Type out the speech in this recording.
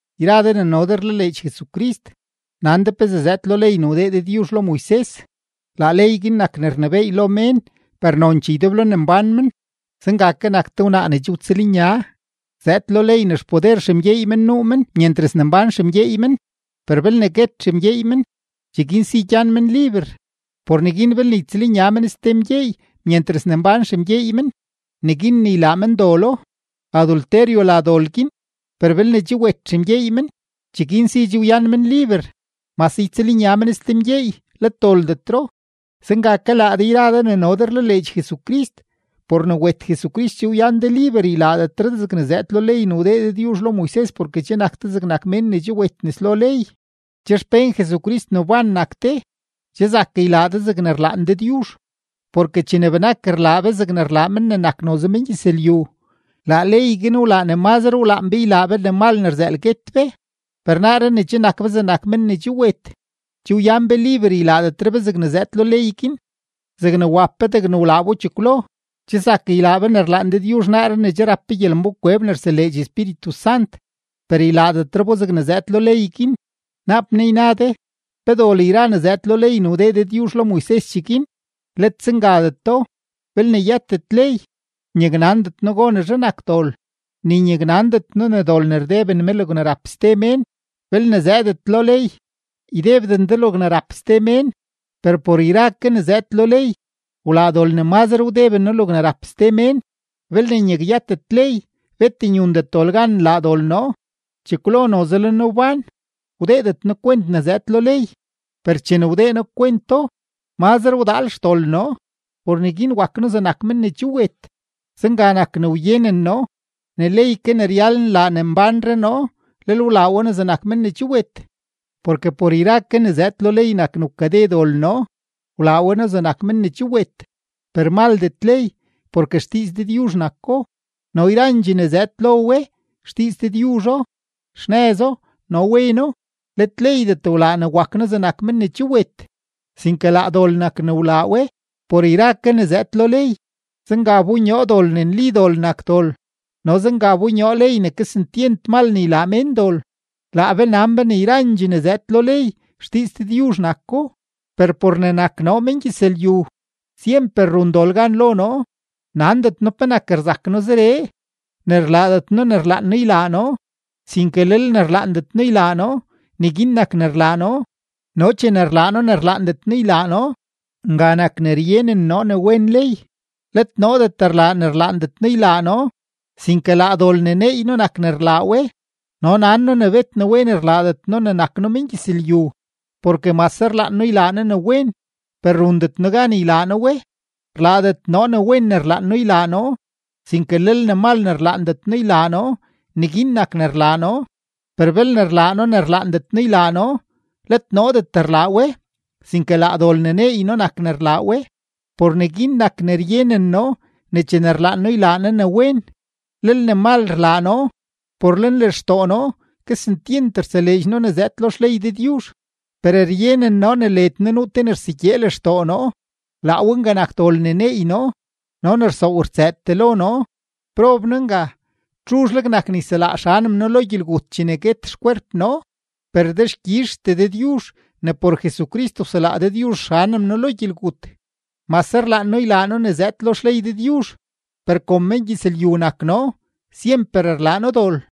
Yra de ne no de rlaleedx Jesucrist, nan de pezee zëëd lo ley ne wdee Dëdyuzh lo Moises, laa ley guin nak ne rnebééy lo mén per nonchee ydeblo ne mbán men. Zenga ke nak te wnaa ne che wtsëlnya, zëëd lo ley ne xpoder xemgyeey men nuu men myentras ne mbán xemgyeey men, per belne guet xemgyeey men, cheguin si che wyan men liber. Por neguin belne ytsëlnya men ste mgyeey myentras ne mbán xemgyeey men, neguin ne ylaa men dolo, adulterio la dol guin; per belne che wet xemgyeey men, cheguin si che wyan men liber. Mase ytsëlnya men ste mgyeey let doldetro. Zenga ke laa de yra de ne no de rlaleedx Jesucrist, por ne wet Jesucrist che wyan de liber ylaadetre de zegne zëëd lo ley ne wdee Dëdyuzh lo Moises porke che nak de zegnak men ne che wet nes lo ley. Che xpén Jesucrist ne wban nak de, che zak ylaa de zegne rlaan Dëdyuzh. Porke chene benak rlaa be zegne rlaa men ne nak noze mengyëzlyu, laa ley guin wlaa ne mazre wlaan be ylaa be ne mal ne rzëël guet be. Per naaree ne che nak be zegnak men ne che wet, che wyan be liber ylaadetre be zegne zëëd lo ley guin zegne wap be degne wlaa bo chekwlo. Che zak ylaa be ne rlaan Dëdyuzh naaree ne che rap be gyelembánkweb ne rseleedx Espíritu Sant, per ylaadetre bo zegne zëëd lo ley guin. Naap naa yna de: “¿Pe dol yra ne zëëd lo ley ne wdee Dëdyuzh lo Moises cheguin?” ¡Let zengadeto! Belne yëtet ley, nyaknandet noo gonezhe nak dol, ni nyaknandet noo ne dol ne rdeben me logne rap ste mén belne zëëdet lo ley: “Ydebden de logne rap ste mén.” Per por yra ke ne zëëd lo ley, wlaa dol ne mazre wdeben noo logne rap ste mén. Belne nyakyëtet ley, bet nyundet dol gan nlaa dol noo. Chekwlo noze le noo wbán, wdeedet noo kwent ne zëëd lo ley, per chene wdee noo kwento, mazre wdaal xdol noo, por neguin wak noo zegnak men ne che wet. Zenga nak ne wyenen noo ne ley ke ne ryal nlaa ne nbánre noo, lel wlaa we noo zegnak men ne che wet. Porke por yra ke ne zëëd lo ley nak ne wkade dol noo, wlaa we noo zegnak men ne che wet. Per maldet ley porke xdiiz Dëdyuzh nako, no yrandxee ne zëëd lo we, xdiiz Dëdyuzho, xnëzo no weno. Let leydet wlaa ne wak noo zegnak men ne che wet, sinke laa dol nak ne wlaa we por yra ke ne zëëd lo ley, zenga wbonyoo dol ne nli dol nak dol no zenga wbonyoo ley ne kesentyent mal ne ylaa mén dol. Laa be nan be ne yrandxee ne zëëd lo ley, xdiiz Dëdyuzh nako, per por ne nak noo mengyëzlyu, syemper run dol gan lo noo. Nandet noo penak rzak noo zeree, ne rlaadet noo ne rlaan noo ylaa noo, sinke lel ne rlaandet noo ylaa noo, neguin nak ne rlaa noo. No chene rlaa noo ne rlaandet noo ylaa noo, nga nak ne ryenen noo ne wen ley. Let noodet rlaa ne rlaandet noo ylaa noo, sinke laa dol ne neey noo nak ne rlaa we. No nan noo ne bet ne wen rlaadet noo ne nak noo mengyëzlyu, porke mase rlaan noo ylaa noo ne wen, per rundet noo gan ylaa noo we. Rlaadet noo ne wen ne rlaan noo ylaa noo, sinke lel ne mal ne rlaandet noo ylaa noo, neguin nak ne rlaa noo. Per belne rlaa noo ne rlaandet noo ylaa noo, let noodet rlaa we, sinke laa dol ne neey noo nak ne rlaa we. Por neguin nak ne ryenen noo ne chene rlaan noo ylaa noo ne wen, lel ne mal rlaa noo. Por lenlextoo noo kesentyent rtseleedx noo ne zëëd lo xley Dëdyuzh. Per ryenen noo ne led noo nuu te ne rsegyee lextoo noo; laa we nga nak dol ne neey noo no ne rsoow rtsëëtee lo noo. ¡Prob noo nga! ¿Txuzhleg nak ne yselaa xanem noo lo gyelgut chene guet xkwerp noo? Per dexkyizhtee Dëdyuzh ne por Jesucrist wselaa Dëdyuzh xanem noo lo gyelgut. Mase rlaan noo ylaa noo ne zëëd lo xley Dëdyuzh, per kom mengyëzlyu nak noo, syemper rlaa noo dol.